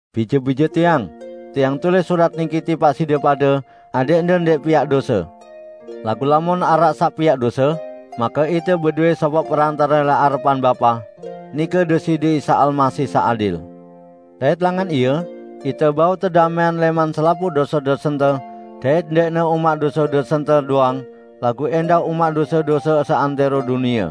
Bije-bije tiang! Tiang tulis surat niki tipaq side pade adẽqde ndẽq piaq dose. Laguq lamun araq saq piaq dose, make ite bedowẽ sopoq perantare lẽq arepan Bapa, nike Deside Isa Almasih saq adil. Dait langan Ie, ite bau tedamẽang lẽman selapuq dose-dosente, dait ndẽqne umaq dose-dosente doang, laguq ẽndah umaq dose-dose seantẽro dunie.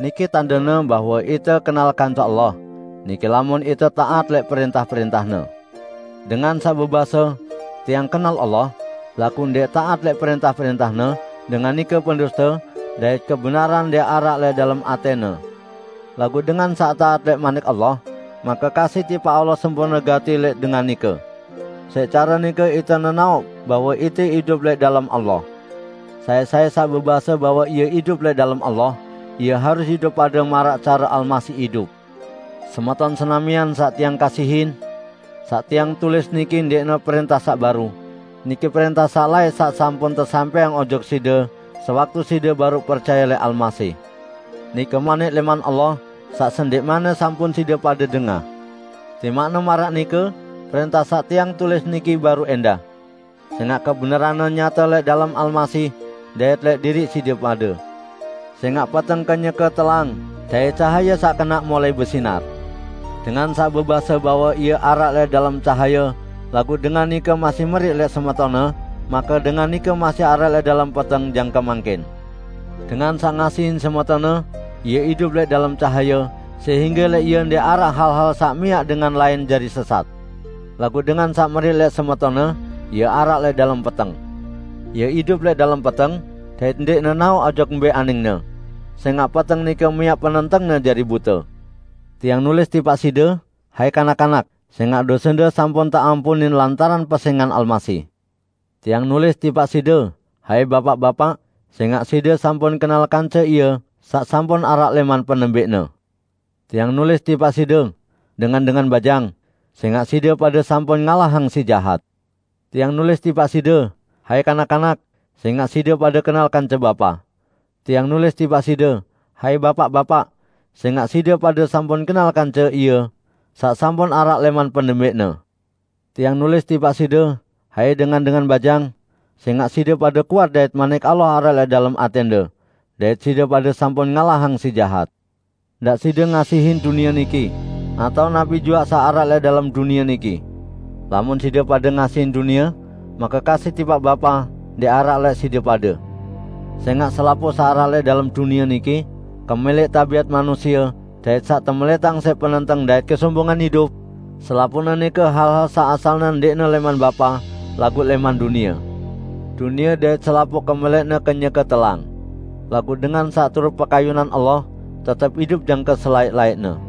Niki tandene bahwe ite kenal kance Allah, nike lamun ite taat lẽq prẽntah-prẽntah-Ne. Dengan saq bebase, "Tiang kenal Allah," laguq ndẽq taat lẽq prẽntah-prẽntah-Ne, dengan nike penduste, dait kebenaran ndẽq araq lẽq dalem atẽne. Laguq dengan saq taat lẽq Manik Allah, make kasih tipaq Allah sempurne gati lẽq dengan nike. Siq care nike ite nenaoq bahwe ite idup lẽq dalem Allah. Sai-sai saq bebase bahwe ie idup lẽq dalem Allah, ie harus idup pade maraq care Almasih idup. Semeton senamian saq tiang kasihin! Saq tiang tulis niki ndẽqne prẽntah saq baru. Niki prẽntah saq laẽq saq sampun tesampẽang ojok side sewaktu side baruq percaye lẽq Almasih. Nike Manik lẽman Allah saq sendẽqmanne sampun side pade dengah. Timaqne maraq nike, prẽntah saq tiang tulis niki baru ẽndah. Sẽngaq kebenaranne nyate lẽq dalem Almasih dait lẽq diriq side pade. Sẽngaq peteng kenyeke telang dait cahaye saq kenaq mulai besinar. Dengan saq bebase bahwe ie araq lẽq dalem cahaye laguq dengan nike masih meriq lẽq semetonne, make dengan nike masih araq lẽq dalem peteng jangke mangkin. Dengan saq ngasihin semetonne, ie idup lẽq dalem cahaye, sehingge lẽq ie ndẽq araq hal-hal saq miaq dengan lain jari sesat. Laguq dengan saq meriq lẽq semetonne, ie araq lẽq dalem peteng. Ie idup lẽq dalem peteng, dait ndẽq nenaoq ojok mbẽ aningne, sẽngaq peteng nike miaq penentengne jari bute. Tiang nulis tipaq side, hai kanak-kanak, sẽngaq dosende sampun teampunin lantaran pesẽngan Almasih. Tiang nulis tipaq side, hai bapaq-bapaq, sẽngaq side sampun kenal kance Ie saq sampun araq lẽman penembẽqne. Tiang nulis tipaq side, dengan-dengan bajang, sẽngaq side pade sampun ngalahang Si Jahat. Tiang nulis tipaq side, hai kanak-kanak, sẽngaq side pade kenal kance Bapa. Tiang nulis tipaq side, hai bapaq-bapaq, sẽngaq side pade sampun kenal kance Ie, saq sampun araq lẽman penembẽqne. Tiang nulis tipaq side, hai dengan-dengan bajang, sẽngaq side pade kuat dait Manik Allah araq lẽq dalem atẽnde, dait side pade sampun ngalahang Si Jahat. Ndaq side ngasihin dunie niki, atao napi juaq saq araq lẽq dalem dunie niki. Lamun side pade ngasihin dunie, make kasih tipaq Bapa ndẽq araq lẽq side pade. Sẽngaq selapuq saq araq lẽq dalem dunie niki -- kemẽlẽq tabiat manusie dait saq temelẽtang siq penenteng dait kesombongan idup -- selapuqne nike hal-hal saq asalne ndẽqne lẽman Bapa, laguq lẽman dunie. Dunie dait selapuq kemẽlẽqne kenyeke telang. Laguq dengan saq turut pekayunan Allah, tetep idup jangke selaẽq-laẽqne.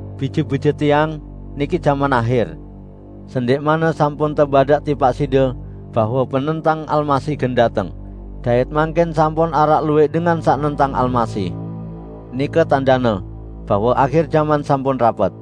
Bije-bije tiang, niki jaman ahir! Sendẽqmanne sampun tebadaq tipaq side bahwe penentang Almasih gen dateng; dait mangkin sampun araq luwẽq dengan saq nentang Almasih. Nike tandene bahwe ahir jaman sampun rapet.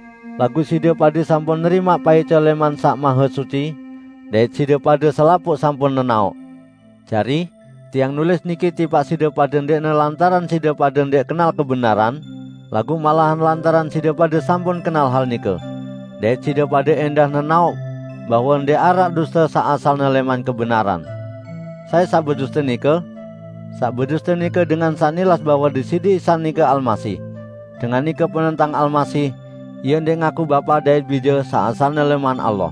Laguq side pade sampun nerimaq paice lẽman saq Mahesuci, dait side pade selapuq sampun nenaoq. Jari, tiang nulis niki tipaq side pade ndẽqne lantaran side pade ndẽq kenal kebenaran, laguq malahan lantaran side pade sampun kenal hal nike, dait side pade ẽndah nenaoq bahwe ndẽq araq duste saq asalne lẽman kebenaran. Sai saq beduste nike? Saq beduste nike dengan saq nilas bahwe Deside Isa nike Almasih. Dengan nike penentang Almasih, ie ndẽq ngakuq Bapa dait Bije saq asalne lẽman Allah.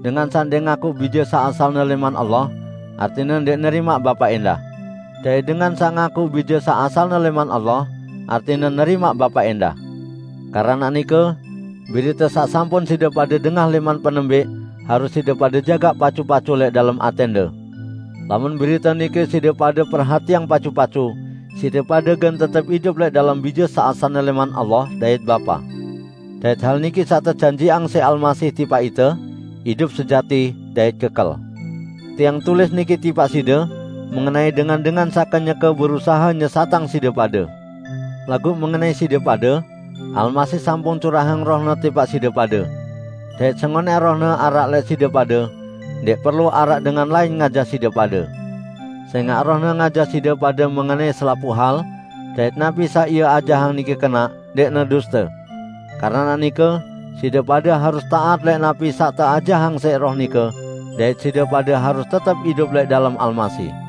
Dengan saq ndẽq ngakuq Bije saq asalne lẽman Allah, artine ndẽq nerimaq Bapa ẽndah. Dait dengan saq ngakuq Bije saq asalne lẽman Allah, artine nerimaq Bapa ẽndah. Keranaq nike, berite saq sampun side pade dengah lẽman penembẽq, harus side pade jagaq pacu-pacu lẽq dalem atẽnde. Lamun berite nike side pade perhatiang pacu-pacu, side pade gen tetep idup lẽq dalem Bije saq asalne lẽman Allah dait Bapa. Dait hal niki saq tejanjiqang siq Almasih tipaq ite; idup sejati dait kekel. Tiang tulis niki tipaq side mengenai dengan-dengan saq kenyeke berusahe nyesatang side pade. Laguq mengenai side pade, Almasih sampun curahang Roh-Ne tipaq side pade. Dait sengonẽq Roh-Ne araq lẽq side pade, ndẽq perlu araq dengan lain ngajah side pade. Sẽngaq Roh-Ne ngajah side pade mengenai selapuq hal; dait napi saq Ie ajahang nike kenaq, ndẽqne duste. Keranaq nike, side pade harus taat lẽq napi saq teajahang siq Roh nike, dait side pade harus tetep idup lẽq dalem Almasih.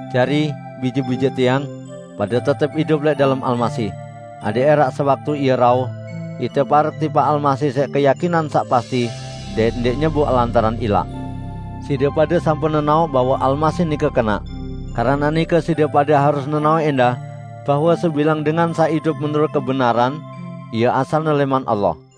Jari, bije-bije tiang, pade tetep idup lẽq dalem Almasih, adẽq ẽraq sewaktu Ie rauh, ite parek tipaq Almasih siq keyakinan saq pasti dait ndẽq nyeboq lantaran ilaq. Side pade sampun nenaoq bahwe Almasih nike kenaq. Keranaq nike side pade harus nenaoq ẽndah bahwe sebilang dengan saq idup menurut kebenaran, ie asalne lẽman Allah.